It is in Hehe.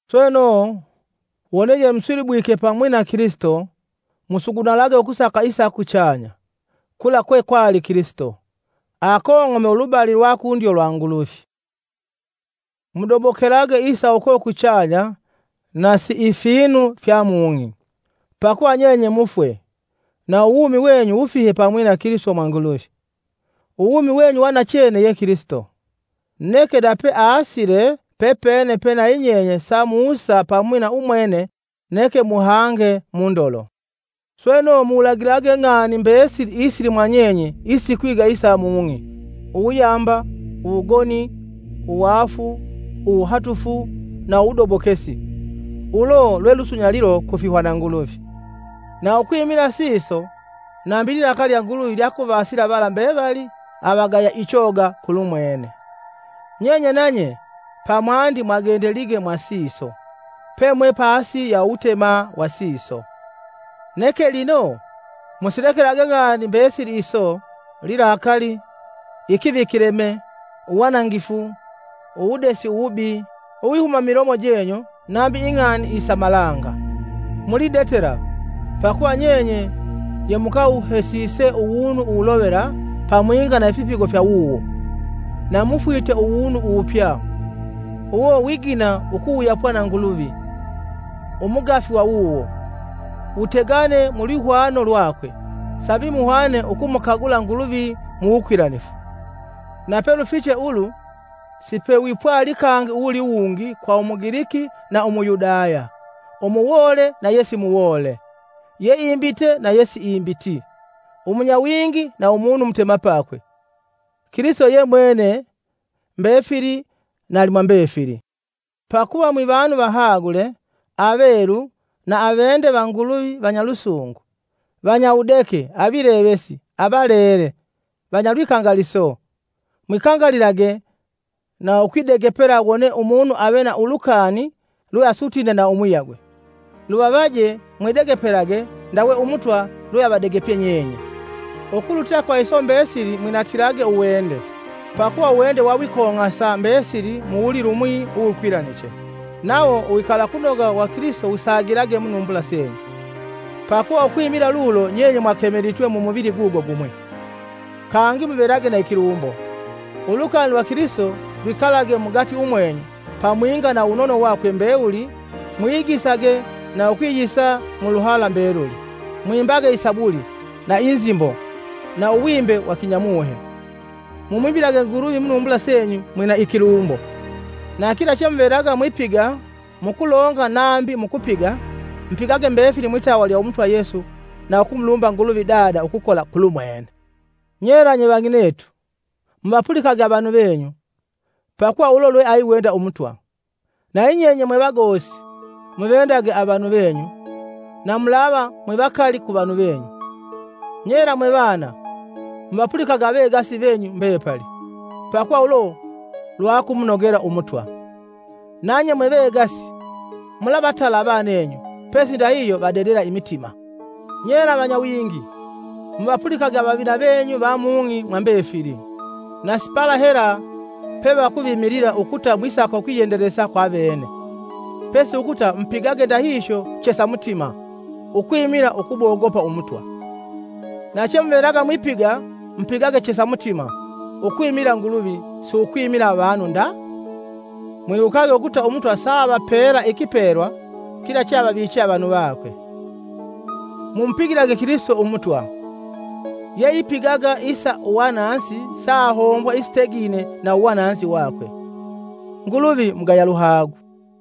Sweno, wone yemusilibwike pamwi na Kilisito, musugunalage ukusaka isa kuchanya, kula kwekwali Kilisito, akong'ome ulubali lwa kundyo lwa Nguluvi. Mudobokelage isa uko kuchanya, na si ifinu fya mung'i. Pakuva nyenye mufwe, na uwumi wenyu wufihe pamwi na Kilisito mwa Nguluvi. Uwumi wenyu wa nachene ye Kilisito, neke nape aasile, pepene pe nayi nyenye samusa pamwi na umwene neke muhange mundolo! Sweno muwulagilage ng'ani mbesili isili mwanyenye isikwiga isa mung'i; uwuyamba, uwugoni, uwaafu, uwuhatufu, na uwudobokesi, ulo lwe lusunyalilo ku fihwananguluvi. Na ukwimila siso, nambi ililakali lya Nguluvi lyakuvasila vala mbevali avagaya ichoga kulumwene. Nyenye nanye pamwandi mwagendelige mwa siso, pemwe pasi ya uwutema wa siso. Neke lino musilekelage ng'ani mbesili iso, lilakali, ikivikileme, uwanangifu, uwudesi uwubi, uwihuma mumilomo jenyu nambi ing'ani isa malanga. Mulidetela, pakuva nyenye yemukawuhesise uwunu uwulovela pamwinga na ifipigo fya wuwo, na mufwite uwunu uwupya. Uwo wigina ukuwuyapwa na Nguluvi, Umugafi wa wuwo, wutegane mulwihwano lwakwe, sambi muhwane ukumukagula Nguluvi mu wukwilanifu. Napelufiche ulu, sipewipwali kangi uwuliwungi kwa Umugiliki na Umuyudaya, umuwoole na yesimuwoole, yeimbite na yesiimbiti, umunyawingi na umunu umutemapakwe. Kilisito ye mwene mbefili, na alimwambefili, Pakuva mwivanu vahagule, avelu na avende va Nguluvi vanyalusungu, vanyawudeke avilevesi, avalele, vanyalwikangaliso. Mwikangalilage na ukwidegepela wone umunu ave na ulukani lwe asutine na umuyagwe. Luvavaje mwidegepelage ndawe umutwa lweavadegepye nyenye. Ukulutila kwa iso mbesili mwinatilage uwende, pakuva uwende wawikong'asa mbesili mu wulilumwi uwukwilaniche. Nawo uwikalakunoga wa Kilisito wusagilage munumbula senyu, pakuva ukwimila lulo nyenye mwakemelitwe mumuvili gugo gumwi. Kangi muvelage na ikilumbo! Ulukani lwa Kilisito lwikalage mugati umwenyu pamwinga na uwunono wakwe mbewuli mwiyigisage na ukwiyisa mu luhala mbeluli. Mwimbage isabuli, na inzimbo, na uwimbe wa kinyamuhe; mumwimbilage Nguluvi munumbula senyu mwina ikilumbo. Na kila chemuvelaga mwipiga, mukulonga nambi mukupiga, mupigage mbefili mwitawa lya Umutwa Yesu na ukumulumba Nguluvi Dada ukukola kulumwene. Nyela nye vang'inetu, muvapulikage avanu venyu, pakuva ulo lweayiwenda Umutwa. Na yinyenye mwevagosi, muvendage avanu venyu, na mulava mwivakali ku vanu venyu. Nyela mwe vana, muvapulikage avegasi venyu mbepali, pakuva ulo lwakumunogela Umutwa. Nanye mwe vegasi, mulavatala avanenyu, pesi ndahihyo vadedela imitima. Nyela vanyawingi, muvapulikage avavina venyu va mung'i mwa mbefili, na si pala hela pevakuvimilila ukuta mwisaka ukwiyendelesa kwa vene; pesi ukuta mupigage ndahihyo chesa mutima, ukwimila ukumogopa umutwa. Na chemuvelaga mwipiga, mupigage chesa mutima, ukwimila Nguluvi si ukwimila avanu nda. Mwiwukage ukuta umutwa saavapela ikipelwa kila cheavaviiche avanu vakwe. Mumupigilage Kilisito umutwa! Yeipigaga isa uwananzi saahombwa isitegine na uwananzi wakwe; Nguluvi mugaya luhagu.